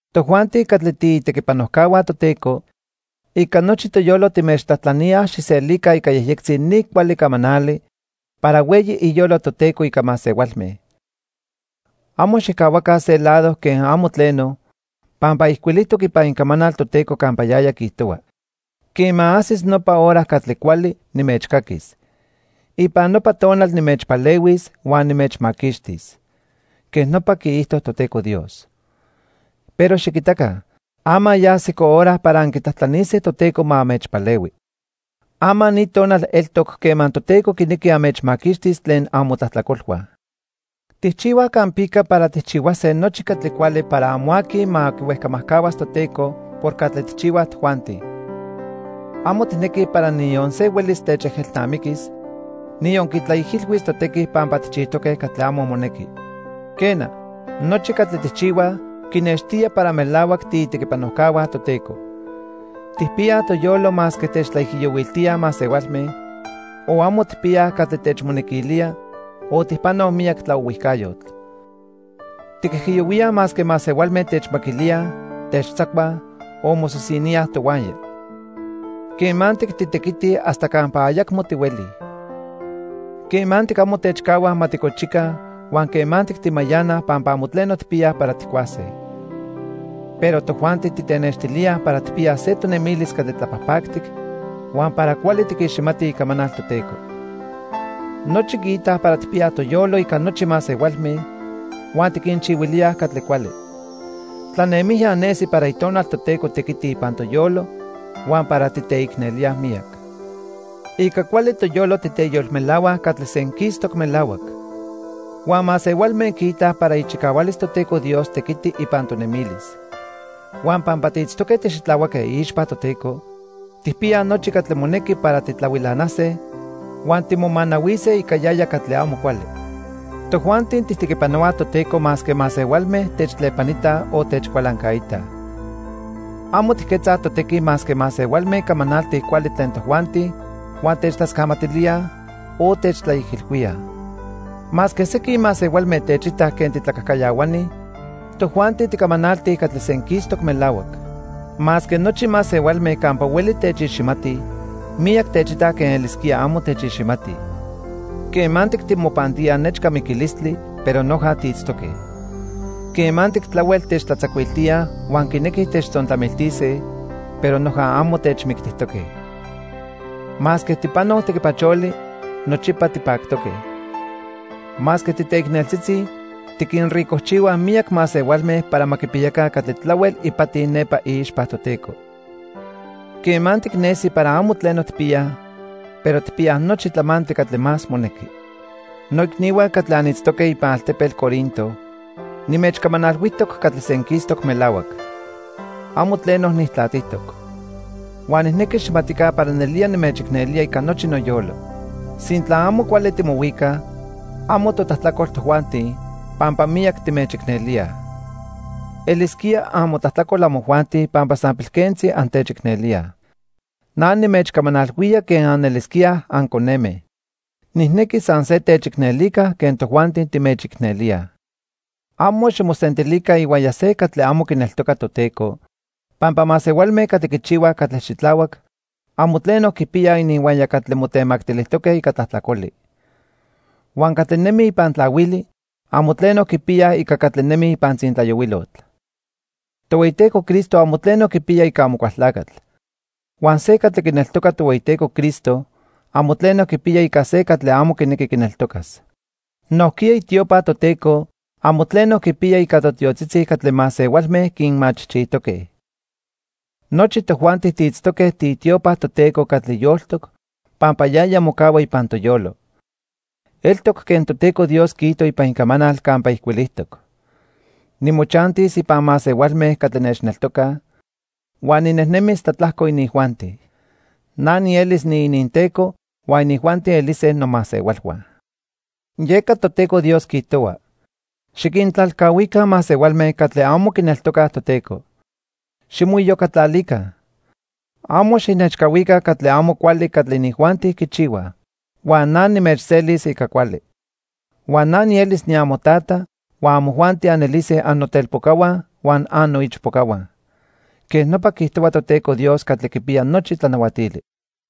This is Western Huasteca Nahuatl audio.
Tojuanti catli tiitequipanojcahua Toteco, ica nochi toyolo timechtlajtlaníaj xijselica ica yejyectzi ni cuali camanali para hueyi iyolo Toteco ica masehualme. Amo xijcahuaca se lado quen amo tleno, pampa ijcuilijtoc ipan Icamanal Toteco campa yaya quiijtohua: "Quema ajsis nopa hora catli cuali, nimechcaquis. Ipan nopa tonal nimechpalehuis huan nimechmaquixtis." Quej nopa quiijto Toteco Dios. Pero xiquitaca, ama ya ajsico hora para anquitlajtlanise Toteco ma anmechpalehui. Ama ni tonal eltoc quema Toteco quinequi anmechmaquixtis tlen amotlajtlacolhua. Tijchihuaj campica para tijchihuase nochi catli cuali para amo aqui ma quihuejcamajcahuas Toteco por catli tijchihuaj tojuanti. Amo tijnequij para niyon se huelis techejelnamiquis, niyon quitlaijilhuis totequi pampa tijchijtoque catli amo monequi. Quena, nochi catli tijchihuaj, quinextía para melahuac tiitequipanojcahua Toteco. Tijpiyaj toyolo masque techtlaijiyohuiltíaj masehualme, o amo tijpiyaj catli techmonequilía o tijpanoj miyac tlaohuijcayotl. Tiquijiyohuíaj masque masehualme techmaquilíaj, techtzacuaj o mosisiníaj tohuaya. Quemantic titequitij hasta campa ayacmo tihuelij. Quemantic amo techcahuaj ma ticochica huan quemantic timayanaj pampa amo tleno tijpiyaj para tijcuase. Pero tojuanti titenextilíaj para tijpiyaj se tonemilis catli tlapajpactic huan para cuali tiquiximatij Icamanal Toteco. Nochi quiitaj para tijpiyaj toyolo ica nochi masehualme huan tiquinchihuilíaj catli cuali. Tlanemijya nesi para Itonal Toteco tequiti ipan toyolo huan para titeicnelíaj miyac. Ica cuali toyolo titeyolmelahuaj catli senquistoc melahuac. Huan masehualme quiitaj para ichicahualis Toteco Dios tequiti ipan tonemilis. Huan pampa tiitztoque tixitlahuaque iixpa Toteco, tijpiyaj nochi catli monequi para titlahuilanase huan timomanahuise ica yaya catli amo cuali. Tojuanti tijtequipanohuaj Toteco masque masehualme techtlepanitaj o techcualancaitaj. Amo tijquetzaj totequi masque masehualme camanaltij cuali tlen tojuanti huan techtlascamatilíaj, o techtlaijilhuíaj. Masque sequin masehualme techitaj quen titlacajcayahuani, tojuanti ticamanaltij catli senquistoc melahuac. Masque nochi masehualme campa hueli techiximatij, miyac techitaj quen elisquía amo techiximatij. Quemantic timopantíaj nechca miquilistli, pero noja tiitztoque. Quemantic tlahuel techtlatzacuiltíaj huan quinequij techtzontlamiltise, pero noja amo techmictijtoque. Masque tijpanoj tequipacholi, nochipa tipactoque. Masque titeicneltzitzi, tiquinricojchihuaj miyac masehualme para ma quipiyaca catli tlahuel ipati nepa iixpa Toteco. Quemantic nesi para amo tleno tijpiyaj, pero tijpiyaj nochi tlamantli catli más monequi. Noicnihua catli anitztoque ipan altepetl Corinto, nimechcamanalhuijtoc catli senquistoc melahuac. Amo tleno nijtlatijtoc. Huan nijnequi xijmatica para nelía nimechicnelía ica nochi noyolo. Sintla amo cuali timohuicaj, amo totlajtlacol tojuanti, pampa miyac timechicnelíaj. Elisquía amotlajtlacol amojuanti pampa san pilquentzi antechicnelíaj. Na nimechcamanalhuía quen anelisquíaj anconeme. Nijnequi san se techicnelica quen tojuanti timechicnelíaj. Amo ximosentilica ihuaya se catli amo quineltoca Toteco, pampa masehualme catli quichihuaj catli xitlahuac amo tleno quipiyaj ininhuaya catli motemactilijtoque ica tlajtlacoli. Huan catli nemij ipan tlahuili amo tleno quipiyaj ica catli nemij ipan tzintlayohuilotl. Tohueyiteco Cristo amo tleno quipiya ica Amocualtlacatl. Huan se catli quineltoca Tohueyiteco Cristo amo tleno quipiya ica se catli amo quinequi quineltocas. Nojquiya itiopa Toteco amo tleno quipiya ica totiotzitzi catli masehualme quinmachijchijtoque. Nochi tojuanti tiitztoque tiitiopa Toteco catli yoltoc pampa yaya mocahua ipan toyolo. Eltoc quen Toteco Dios quiijto ipan Icamanal campa ijcuilijtoc: "Nimochantis ipan masehualme catli nechneltocaj, huan ninejnemis tlatlajco inijuanti. Na nielis niininTeco, huan inijuanti elise nomasehualhua." Yeca Toteco Dios quiijtohua: "Xiquintlalcahuica masehualme catli amo quineltocaj Toteco. Ximoiyocatlalica. Amo xijnechcahuica catli amo cuali catli inijuanti quichihuaj. Huan na nimechselis ica cuali. Huan na nielis niamoTata, huan amojuanti anelise annotelpocahua huan annoichpocahua. Quej nopa quiijtohua Toteco Dios Catli Quipiya Nochi Tlanahuatili."